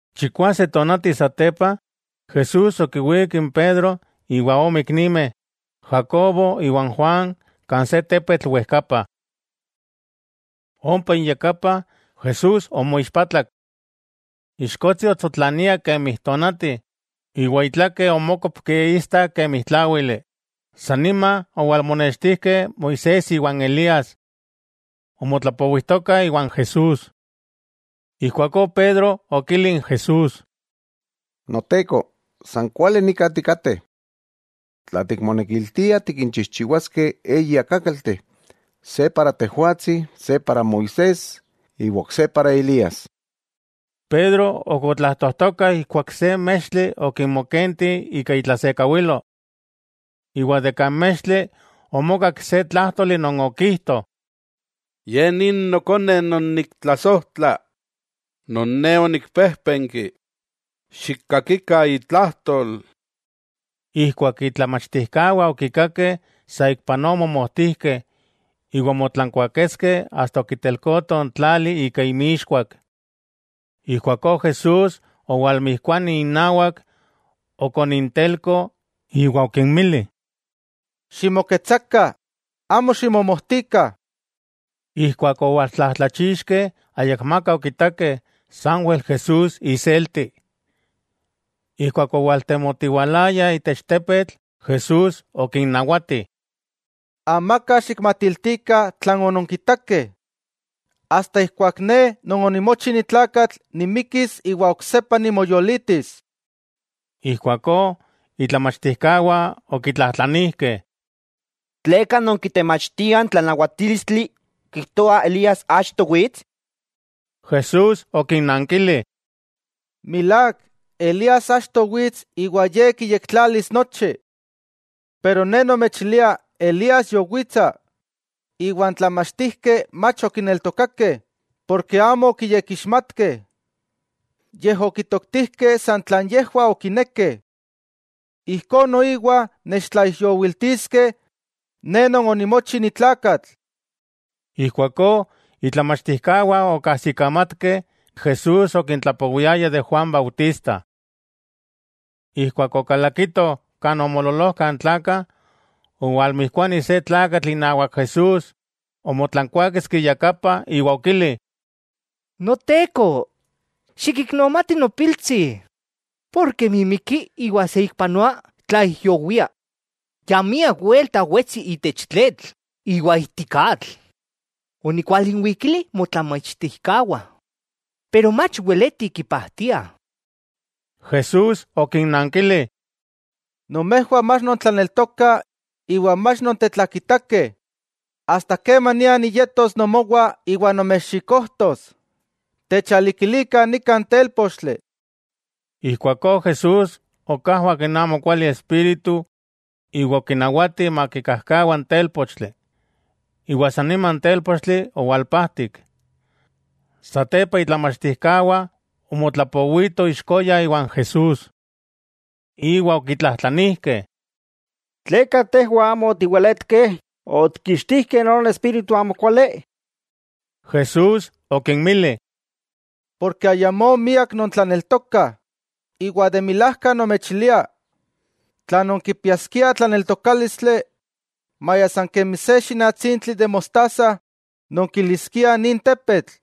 Chikwase tonati satepa, Jesús okiwík n Pedro, iwa ome iknimeh, Jacobo iwa n Juan kan se tepetl wejkapa. Ompa inyakapah, Jesús omoixpatlak. Ixkotsi otsotlania kemi n tonati iwa itlake omókopki istak kemi tláwili. Sa nima owalmonextijkeh Moisés iwa n Elías. Omotlapowijtokah iwan Jesús. Ijkuakó Pedro okili n Jesús: —Noteko, ¡san kuali nika tikateh! Tla tikmonekiltia tikinchijchiwas-keh eyi akákalteh, se para Tejwatsi, se para Moisés iwa ok se para Elías. Pedro ok otlajtojtoka ijkuak se mextli okinmokenti ika itlasekawilo. Iwa de kan mextli omokak se tlájtoli non okijto: —Ye ni Nokone non niktlasojtla, non Ne onikpejpenki xikkakikah itlajtol. Ijkuak itlamachtijkawah okikakeh, saikpanoa omomojtijkeh iwa omotlankuaketskeh asta okitelkoto n tlali ika inmixkuak. Ijkuakó Jesús owalmijkuani innawak, okonnintelko iwa okinmili: —Ximoketsakah, amo ximomojtikah. Ijkuak owaltlajtlachixkeh ayakmaka okitakeh, sanwel Jesús iselti. Ijkuak owaltemotiwalayah itech tepetl Jesús okinnawati: —Amaka xikmatiltikah tlan ononkitakeh, asta ijkuak Ne Non onimochi ni tlakatl, nimikis iwa oksepa nimoyolitis. Ijkuakó itlamachtijkawah okitlajtlanijkeh: —¿Tleka non kitemachtiah n tlanawatílistli kijtoah Elías achto wits? Jesús okinnankili: —Milák, Elías achto wits iwa ye kiyektlalis nochi. Pero Ne nomechilia Elías yowitsa, iwa n tlamachtijkeh mach okineltokakeh porke amo okiyekixmatkeh, yej okitoktijkeh san tlan yejwah okinekeh. Ijkó noiwa nechtlaijyowiltiskeh Ne Non onimochi ni tlakatl. Ijkuakó itlamachtijkawah okajsikamatkeh Jesús okintlapowiaya de Juan Bautista. Ijkuak okalakitoh kan omoololojkah n tlakah, owalmijkuani se tlakatl inawak Jesús, omotlankuáketski iyakapa iwa okili: —Noteko, xikiknomati nopiltsi, mimiki iwa saikpanoa tlaijyowia, ya miak welta wetsi itech tletl iwa ijtik atl. Onikinwalikili motlamachtijkawah, iwa mach weletih kipajtiah. Jesús okinnankili: —¡Nomejwah mach nontlaneltokah iwa mach nontetlakitakeh! ¡Asta kemania niyetos nomowah iwa nomechxikojtos! Techalikilikah nika n télpochtli. Ijkuakó Jesús okajwak n amokuali espíritu iwa okinawati makikajkawa n télpochtli, iwa sa nima n télpochtli owalpajtik. Satepa itlamachtijkawah omotlapowitoh ixkoya iwa n Jesús. Iwa okitlajtlanijkeh: —¿Tleka tejwah amo otiweletkeh otikkixtijkeh non espíritu amokuali? Jesús okinmili: —Porke ayamó miak nontlaneltokah. De milajka nomechilia tla nonkipiaskiah tlaneltokálistli maya san kemi se xínatsintli de mostaza, nonkiliskiah nin tepetl: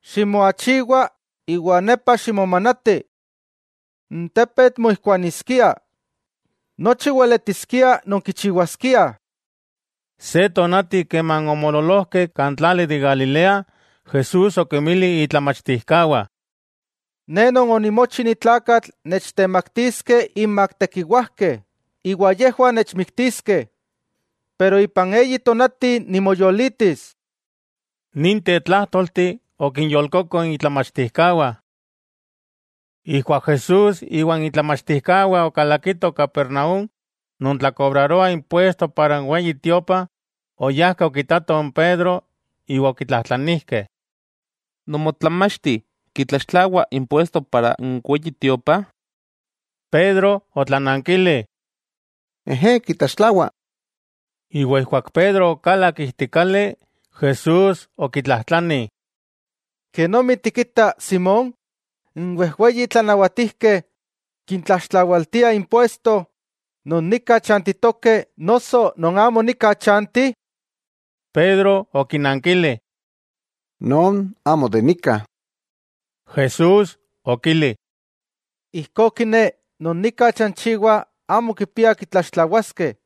“Ximoachiwa iwa nepa ximomanati.” N tepetl moijkuaniskia. Nochi weletiskiah nonkichiwaskiah. Se tonati keman omoololojkeh kan tlali de Galilea, Jesús okinmili itlamachtijkawah: Ne Non onimochi ni tlakatl nechtemaktiskeh inmak tekiwajkeh, iwa yejwah nechmiktiskeh, pero ipan eyi tonati nimoyolitis. Ninteh tlájtolteh okinyolkoko itlamachtijkawah. Ijkuak Jesús iwa itlamachtijkawah okalakitoh Capernaúm, non tlakobraroah impuesto para n Weyi Tiopa oyajkeh okitatoh n Pedro iwa okitlajtlanijkeh: —¿Nomotlamachti kitlaxtlawa impuesto para n Weyi Tiopa? Pedro otlanankili: —Ejé, kitlaxtlawa. Iwa ijkuak Pedro okalak ijtik kali, Jesús okitlajtlani: —¿Kenomi tikita, Simón? ¿N wejweyi tlanawatijkeh kintlaxtlawaltiah impuesto non nika chantitokeh noso non amo nika chanti? Pedro okinankili: —Non amo de nika. Jesús okili: —Ijkó kiné non nika chanchiwa amo kipiah kitlaxtlawaskeh.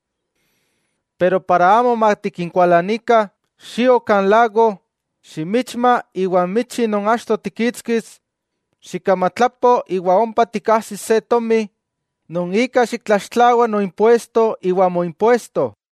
Ijkó para amo matikinkualanikah, xio kan lago, ximichma iwa n michi non achto tikkixtis, xikkamatlapo iwa ompa tikajsis se tomi non ika xiktlaxtlawa noimpuesto iwa moimpuesto.